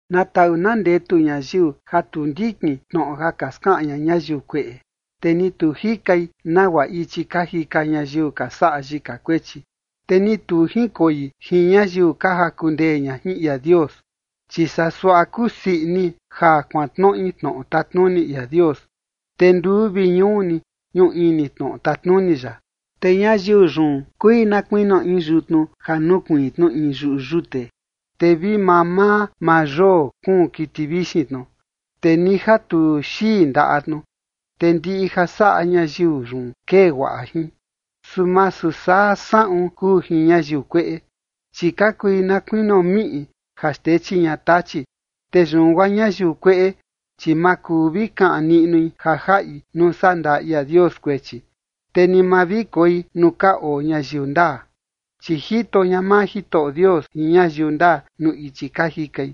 Na taꞌu na ndetu ñayiu ja tu ndikin tnoꞌo ja ka skaꞌan ña ñayiu kueꞌe, te ni tu jikai nagua ichi ka jika ñayiu ka saꞌa yika kuechi, te ni tu junkoi jin ñayiu ka jaku ndee ña jin ia Dios. Chi saa suaꞌa kusii ini ja kuantnoꞌi tnoꞌo tatnuni ia Dios, te nduu vi ñuu ni, ñuꞌu ini tnoꞌo tatnuni ya. Te ñayiu yun kui na kuinio in yutnu ja nukuiin tnu in yuꞌu yute, te vi mamaa maa yoo kuun kiti vixin tnu, te ni ja tu xii ndaꞌa tnu, te ndiꞌi ja saꞌa ñayiu yun kee guaꞌa jin. Su masu saa saꞌun kuu jin ñayiu kueꞌe, chi ka kui na kuinio miꞌi ja xtechi ña tachi. Te yun guaa ñayiu kueꞌe, chi ma kuu vi kaꞌan niꞌnui ja jaꞌi nuu sandaa ia Dios kuechi, te ni ma vi koi nuu ka oo ñayiu ndaa. Chi jito ña maa Jitoꞌo Dios jin ñayiu ndaa nuu ichi ka jikai,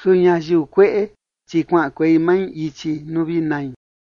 su ñayiu kueꞌe, chi kuaꞌankuei mai ichi nuu vi nai.